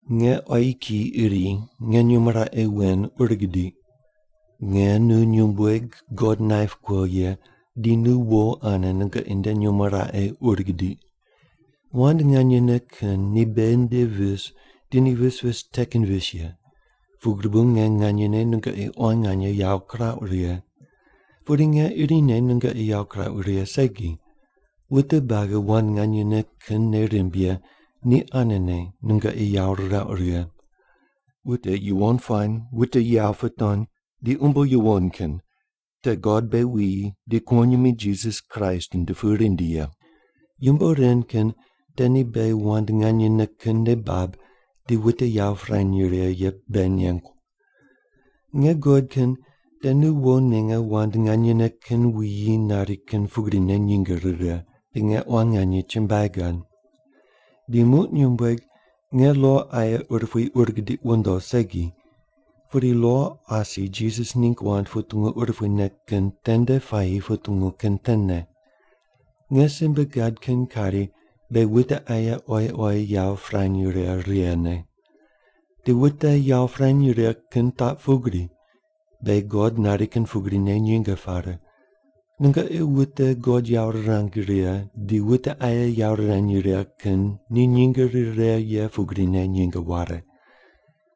Nge quayi kiyi iri nge nyumo raqe wen ur gidiq. Nge nu nyumbueg God naip kuo ye di nu wo ane nungoqi nde nyumo raqe ur gidiq. Wand nganyene kin ni beghi nde vis di ni vis vis te kin vis ye, pugri bu nge nganyene nungoqi quan nganye yawo kirauq righe. Pudi nge irine nungoqi yawo kirauq righe segi. Wute buagi wand nganyene kin nei rimb ye ni anene nungoqi yawo rirauq righe. Wute yuwon puany, wute yawo putony di umbo yuwon kin te God beghi wuyi di kuwonyimi Jisas Kraist nde pu rindi ye. Yumbo ren kin te ni beghi wand nganyene kin nei bab di wute yawo pirany righe ye beghi nengu. Nge guqod kin te nu wo ninge wand nganyene kin wuyi nari kin pugrine nyinge rire, di nge quan nganye chumbuai gad. Di muq nyumbueg, nge lo aye urupui ur gidiq wundo segi, pudi lo asi Jisas ningg wand putungu urupuine kin tende puayi putungu kin tene. Nge simbe gad kin kari beghi wute aye oyi oyi yawo pirany righe righene. Di wute yawo pirany righe kin taq pugri: Beghi God nari kin pugrine nyinge pare. Nungoqi wute God yawo rirang righe di wute aye yawo rirany righe kin ni nyinge rire ye pugrine nyinge ware.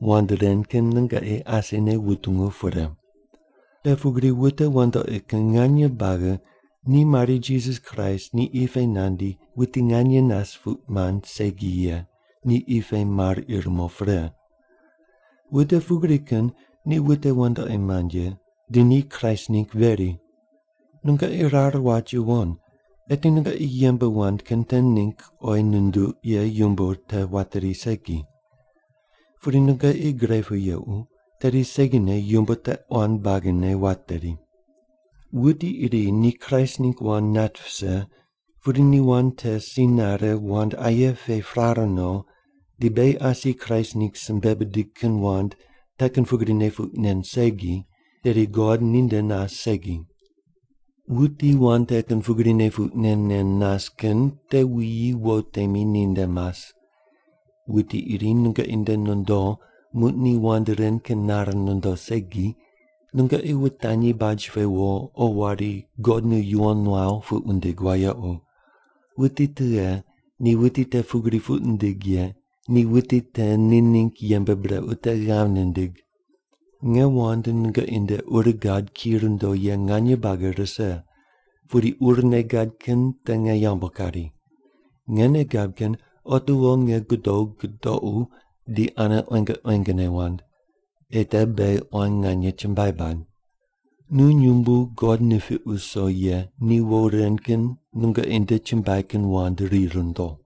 Wand ren kin nungoqi asine wutungu pre. Te pugri wute wandoqi kin nganye buagi ni mari Jisas Kraist ni qi pe nandi wuti nganye nas puq mand segi ye ni qi pe mar ir mo pre. Wute pugri kin ni wute wandoqi mand ye, di ni Kraist ningg veri. Nungoqi rar wat yuwon, eti nungoqi yembe wand kin te ningg oyi nunduq ye yumbo te wateri segi. Pudi nungoqi gre pu yequ, tedi segine yumbo te quan buagine wateri. Wuti iri ni Kraist ningg wand nat vise pudi ni wand te si nare wand aye pe prare no di beghi asi Kraist ningg simbe bidig kin wand te kin pugrine puq nen segi, tedi God ninde nas segi. Wuti wand te kin pugrine puq nen nen nas kin te wuyi wo temi ninde mas. Wuti iri nungoqi nde nondo, muq ni wand ren kin nare nondo segi, nungoqi wutanyi baj pe wo o wari “God nu yuwon nuaw” puq wundig wayequ. Wuti tughe ni wuti te pugri puq nindig ye ni wuti te ni ningg yembe brequ te ghav nindig. Nge wand nungoqi nde ur gad ki rundo ye nganye buagi rise, pudi urne gad kin te nge yambu kari. Nge nei gab kin otiwo nge godo gudoqu di ane quenge quengene wand, ei te beghi quan nganye chumbuai bad. Nu nyumbu God nipiq wuso ye ni wo ren kin nungoqi nde chumbuai kin wand ri rundo.